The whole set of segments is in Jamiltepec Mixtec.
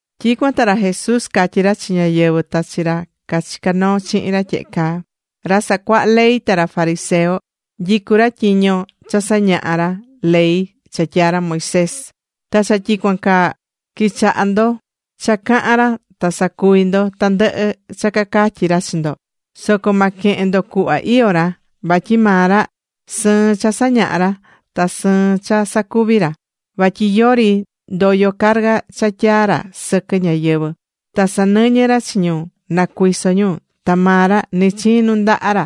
Tyicuan ta ra Jesús catyí ra chi ñáyɨvɨ, ta chi ra cachicá noo chihin ra tyehe caa: ―Ra sacuahá ley ta ra fariseo nyicú ra tyiño cha sañahá ra ley cha tyaa̱ ra Moisés. Ta cha tyicuan caa, qui̱chaha ndo cha cahán ra ta sa̱cuvi ndo tandɨhɨ cha cacatyí ra chi ndo. Soco ma quehen ndo cuhva iyó ra, vatyi maa ra, sɨɨn cha sañaha ra, ta sɨɨn cha sacuví ra. Vatyi yori ndoyo carga cha tyaá ra sɨquɨ ñáyɨvɨ. Ta sanɨñɨ ra chi ñu na cuiso ñu, ta maa ra ni chiin nundaha ra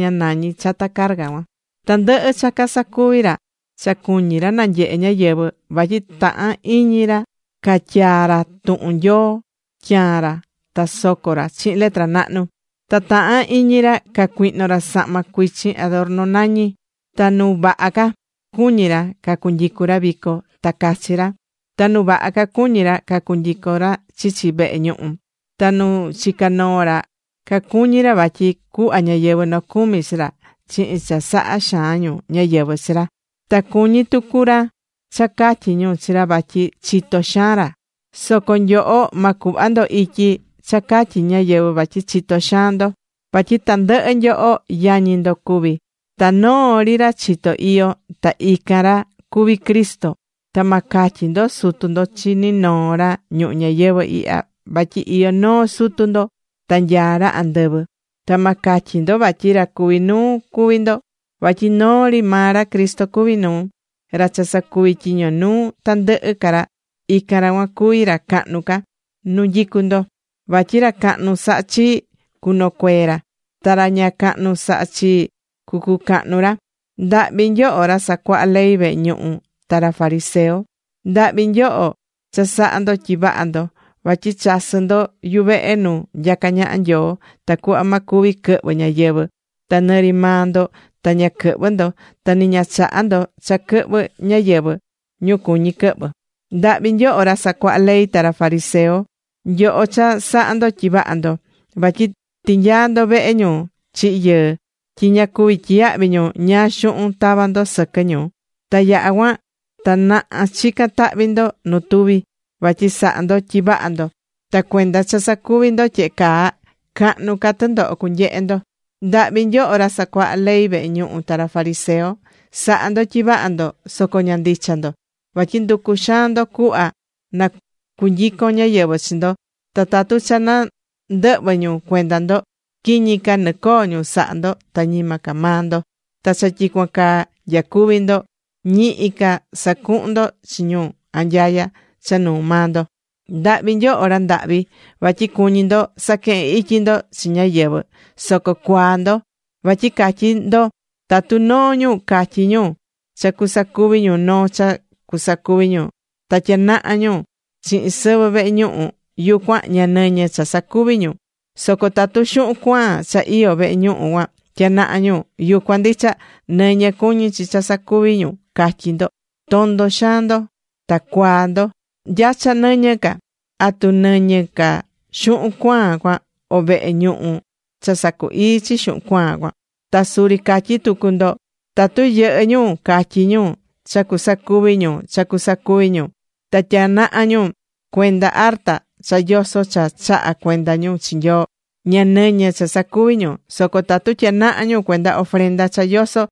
ña nañi chata carga cuan. Tandɨhɨ cha casacuví ra, cha cuñi ra na nyehe ñáyɨvɨ. Vatyi tahán iñi ra catyaa ra tuhun Nyoo tyaan ra ta soco ra chihin letra nahnu. Ta tahán iñi ra cacuihno ra sahma chihin adorno nañi. Ta nu vaha ca, cuñí ra cunyicu ra vico, ta cachi ra. Ta nu vaha ca cuñí ra cunyicu ra chichi vehe ñuhu. Ta nu chicá noo ra cacuñí ra vatyi cuhva ñáyɨvɨ nocumi chi ra chihin cha sahá xaan ñu ñáyɨvɨ chi ra. Ta cuñí tucu ra cha catyi ñu chi ra vatyi chito xaan ra. Soco nyoho, ma cuhva ndo ityi cha catyi ñáyɨvɨ vatyi chitó xaan ndo. Vatyi tandɨhɨ nyoho, yañi ndo cuví. Ta noo ri ra chitó iyó, ta ican ra cuví Cristo. Ta ma catyi ndo Sutu ndo chi ninoo ra ñuhu ñayɨvɨ ihya, vatyi iyó noo Sutu ndo, ta nyaá ra andɨvɨ. Ta ma catyi ndo vatyi ra cuví nuu cuví ndo, vatyi noo ri maa ra Cristo cuví nuu. Ra cha sacuví tyiño nuu tandɨhɨ ca ra, ican ra cuan cuví ra cahnu ca nu nyicú ndo. Vatyi ra cahnu sahá chii, cunocuee ra. Ta ra ña cahnu sahá chii cucucahnu ra. ’¡Ndahvi nyoho ra sacuahá ley vehe ñuhu, ta ra fariseo! ¡Ndahvi nyoho cha sahá ndo tyi vaha ndo! Vatyi chasɨ́ ndo yuvehe nu nyacá ñaha Nyoo, tacuhva ma cuvi quɨhvɨ ñáyɨvɨ. Ta ni ri maa ndo ña quɨhvɨ́ ndo ta ni ña chahá ndo cha quɨhvɨ ñáyɨvɨ, ñu cuñí quɨhvɨ. ’¡Ndahvi nyoho ra sacuahá ley ta ra fariseo, nyoho cha sahá ndo tyi vahá ndo! Vatyi tinyaá ndo vehe ñu chihi̱ yɨɨ, tyi ña cuví tyiyahvi ñu ñáá xuhun tavá ndo sɨquɨ ñu. Ta yaha̱ cuan, ta naha chicán tahvi ndo nu tuvi vatyi sahá ndo tyi vaha ndo. Ta cuenda cha sacuví ndo tyehe caa, cahnu ca tɨndoho cunyehe ndo. ’Ndahvi nyoho ra sacuahá ley vehe ñuhu, ta ra fariseo. ¡Sahá ndo tyi vaha ndo, soco ña ndicha ndo! Vatyi nducú xaan ndo cuhva na cunyicon ñáyɨvɨ chi ndo. Ta tatu cha nandɨhvɨ ñu cuenda ndo, quiñi caa nɨcoo ñu saha ndo, ta ñima ca maa ndo. Ta cha tyicuan caa nyacuví ndo, ñihi ca sacuhún ndo chi ñu anyaya cha nuu maa ndo. ’¡Ndahvi nyoho ra ndahvi! Vatyi cuñí ndo saquehen ityi ndo chi ñáyɨvɨ, ¡soco cuaa ndo! Vatyi catyí ndo tatu noo ñu catyí ñu cha cusacuvi ñu noo cha cusacuvi ñu, ta tyanaha ñu chihin sɨvɨ vehe ñuhu, yucuan ña nɨñɨ cha sacuvi ñu. Soco tatu xuhun cuaan cha iyó vehe ñuhu cuan tyanaha ñu, yucuan ndicha, nɨñɨ cuñí chi cha sacuvi ñu, catyí ndo. ¡Tondo xaan ndo ta cuaa ndo! ¿Nya cha nɨñɨ ca? ¿Atu nɨñɨ ca xuhun cuaan cuan, o vehe ñuhu cha sacu ii chi xuhun cuaan cuan? Ta suri catyí tucu ndo: “Tatu yɨhɨ́ ñu catyí ñu cha cusacuvi ñu cha cusacuvi ñu, ta tyanaha ñu cuenda arta cha yoso cha chahá cuenda ñu chi Nyoo, ña nɨñɨ cha sacuvi ñu. Soco tatu tyanaha ñu cuenda ofrenda cha yosó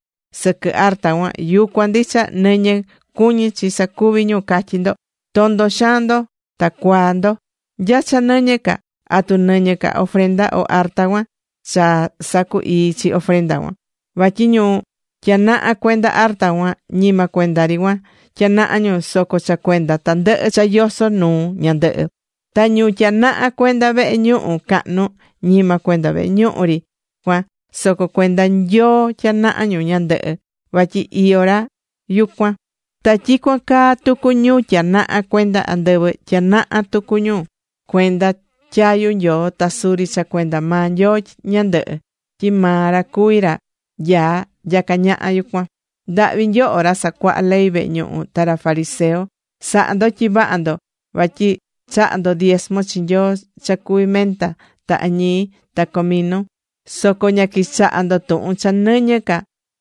sɨquɨ arta cuan, yucuan ndicha nɨñɨ cuñí chi sacuvi ñu, catyí ndo.” ¡Tondo xaan ndo ta cuaa ndo! ¿Nya cha nɨñɨ ca? ¿Atu nɨñɨ ca ofrenda o arta cuan cha sacu ii chi ofrenda cuan? Vatyi ñu tyanahá cuenda arta cuan, ñima cuenda ri cuan tyanaha ñu, soco cha cuenda tandɨhɨ cha yosó nuu ñandɨhɨ. Ta ñu tyanahá cuenda vehe ñuhu cahnu, ñima cuenda vehe ñuhu ri cuan, soco cuenda Nyoo tyanahá ñu ñandɨhɨ, vatyi iyó ra yucuan. Ta tyicuan caa tucu ñu tyanahá cuenda andɨvɨ, tyanahá tucu ñu cuenda tyayu Nyoo ta suri cha cuenda maa Nyoo ñandɨhɨ, tyi maa ra cuví ra nyaá nyacá ñaha yucuan. ’¡Ndahvi nyoho ra sacuahá ley vehe ñuhu ta ra fariseo! sahá ndo tyi vaha ndo vatyi chahá ndo diesmo chi Nyoo cha cuví menta, ta añii, ta comino. Soco ña quichahá ndo tuhun cha nɨñɨ ca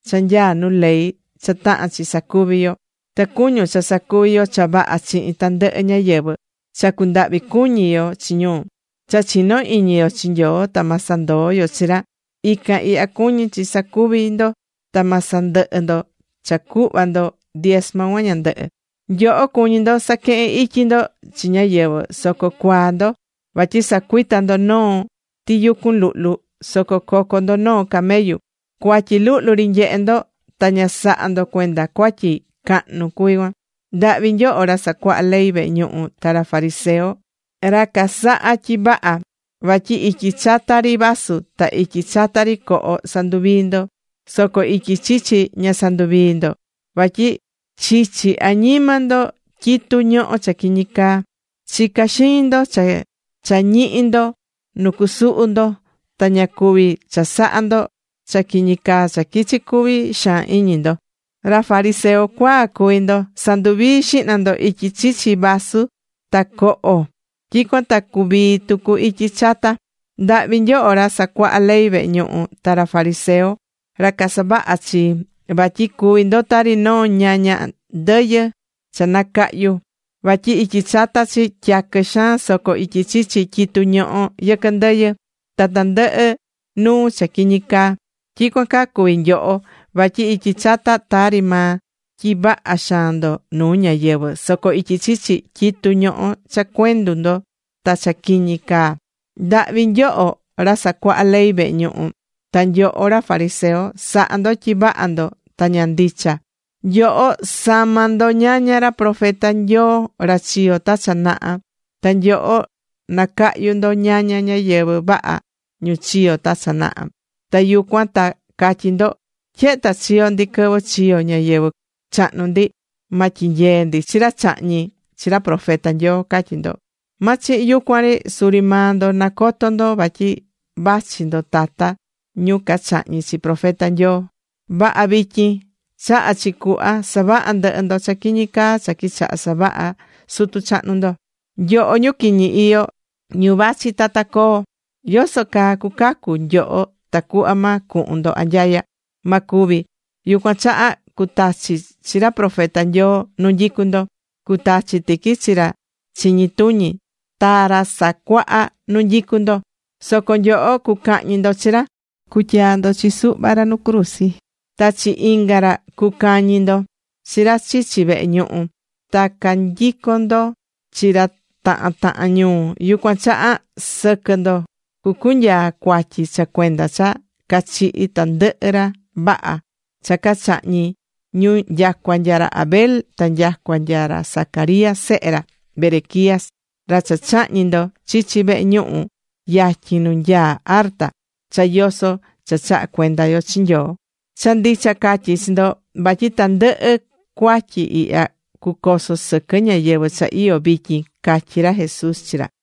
cha nyaá nu ley cha tahán chi sacuvi yo. Ta cuñun, cha sacuví yo cha vaha chihin tandɨhɨ ñáyɨvɨ, cha cundahvi cuñi yo chi ñu, cha chinó iñi yo chi Nyoo ta ma sandoo yo chi ra. Ican ihya cuñí chi sacuvi ndo, ta ma sandɨhɨ ndo cha cuhva ndo diesmo cuan ñandɨhɨ. Nyoho cuñí ndo casaquehen ityi ndo chi ñáyɨvɨ, soco cuaa ndo. Vatyi sacuita ndo noo tiyucun luhlu, soco coco ndo noo camellu. Cuatyi luhlu ri nyehe ndo ta ña sahá ndo cuenda cuatyi cahnu cuví cuan. ’¡Ndahvi nyoho ra sacuahá ley vehe ñuhu ta ra fariseo, ra casaha tyi vaha! Vatyi ityi chata ri vasu ta ityi chata ri coho sanduvií ndo, soco ityi chichi ña sanduvií ndo. Vatyi chichi añima ndo tyitu ñohó cha quiñi caa. Chicá xiñi ndo cha ñihi ndo nu cusuhu ndo, ta ña cuví chasaha ndo cha quiñi caa cha quichi cuvi xaan iñi ndo. ¡Ra fariseo cuaa cuví ndo! Sa̱nduvii xihna ndo ityi chichi vasu ta coho, tyicuan ta cuvii tucu ityi chata. ’¡Ndahvi nyoho ra sacuahá ley vehe ñuhu ta ra fariseo, ra casavaha chii! Vatyi cuví ndo tari noo ñaña ndɨyɨ cha nacahyu, vatyi ityi chata chi tyaquɨ xaan, soco ityi chichi tyitu ñohó yɨquɨ ndɨyɨ, ta tandɨhɨ nuu cha quiñi caa. Tyicuan caa cuví nyoho. Vatyi ityi chata tari maa tyi vaha xaan ndo nuu ñáyɨvɨ, soco ityi chichi, tyitú ñohó cha cuendu ndo, ta cha quiñi caa. ’¡Ndahvi nyoho ra sacuahá ley vehe ñuhu, ta nyoho ra fariseo! Sahá ndo tyi vaha ndo ta ña ndicha. Nyoho samá ndo ñaña ra profeta Nyoo ra chiyo̱ ta cha naha. Ta nyoho nacahyu ndo ñaña ñáyɨvɨ vaha ñu chiyo ta cha naha. Ta yucuan ta catyí ndo! “Tyehe ta chiyo̱ ndi quɨvɨ chiyo̱ ñáyɨvɨ chahnu ndi, ma tyinyee ndi chi ra chahñi̱ chi ra profeta Nyoo”, catyí ndo. ¡Ma chihin yucuan ri! Suri maa ndo nacotó ndo vatyi vachi ndo tata ñu cachahñi̱ chi profeta Nyoo. ¡Vaha vityin, chaha chi cuhva savaha ndɨhɨ ndo cha quiñi caa cha quichaha savaha sutu chahnu ndo! ’¡Nyoho ñu quiñi iyó, ñu vachi tata coo! ¿Yoso caa cucacu nyoho tacuhva ma cuhun ndo anyaya? Ma cuvi. Yucuan chaha cutachi chi ra profeta Nyoo nu nyicú ndo, cutachi tiqui chi ra chiñi tuñi, ta ra sacuahá nu nyicú ndo. Soco nyoho cucahñi ndo chi ra ta cutyaa ndo chi suhva ra nu cruzi. Ta chi inga ra cucañi ndo chi ra chichi vehe ñuhu. Ta cacanyicon ndo chi ra tahan tahan ñuu. Yucuan chaha, sɨquɨ ndo cucunyaa cuatyi cha cuenda cha cachihi̱ tandɨhɨ ra vaha cha cachahñi̱ ñu nyacua nya ra Abel ta nyacua nya ra Zacarías sehe ra Berequías ra cha chahñi̱ ndo chichi vehe ñuhu yatyin nu nyaá arta cha yosó cha chahá cuenda yo chi Nyoo. Cha ndicha catyí chi ndo, vatyi tandɨhɨ cuatyi ihya cucoso sɨquɨ ñáyɨvɨ cha iyó vityin ―catyí ra Jesús chi ra.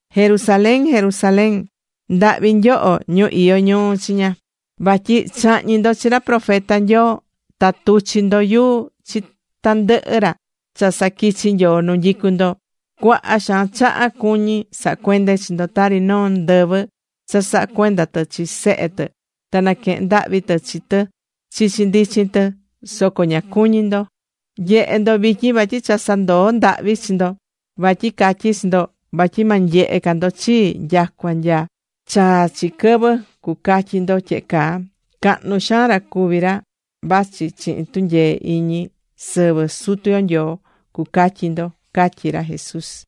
’¡Jerusalén, Jerusalén! ¡Ndahvi nyoho ñu iyó ñuu chiña! Vatyi chahñi̱ ndo chi ra profeta Nyoo. Ta tuchi̱ ndo yuu chi tandɨhɨ ra cha saquichi̱ Nyoo nu nyicú ndo. Cuaha xaan chaha cuñí saha cuende chi ndo, tari noo ndɨvɨ cha sahá cuenda tɨ chi sehe tɨ, ta naquehén ndahvi tɨ chi tɨ chichi ndichin tɨ, soco ña cuñí ndo. Nye̱he ndo vityin, vatyi cha sandoo̱ ndahvi chi ndo. Vatyi catyí chi ndo, vatyi ma nyehe ca ndo chii nyacua nya chaa chi quɨvɨ cucatyi ndo tyehe caa: “Cahnu xaan ra cuví ra vachi chihin tunyee iñi sɨvɨ Sutu yo Nyoo”, cucatyi ndo ―catyí ra Jesús.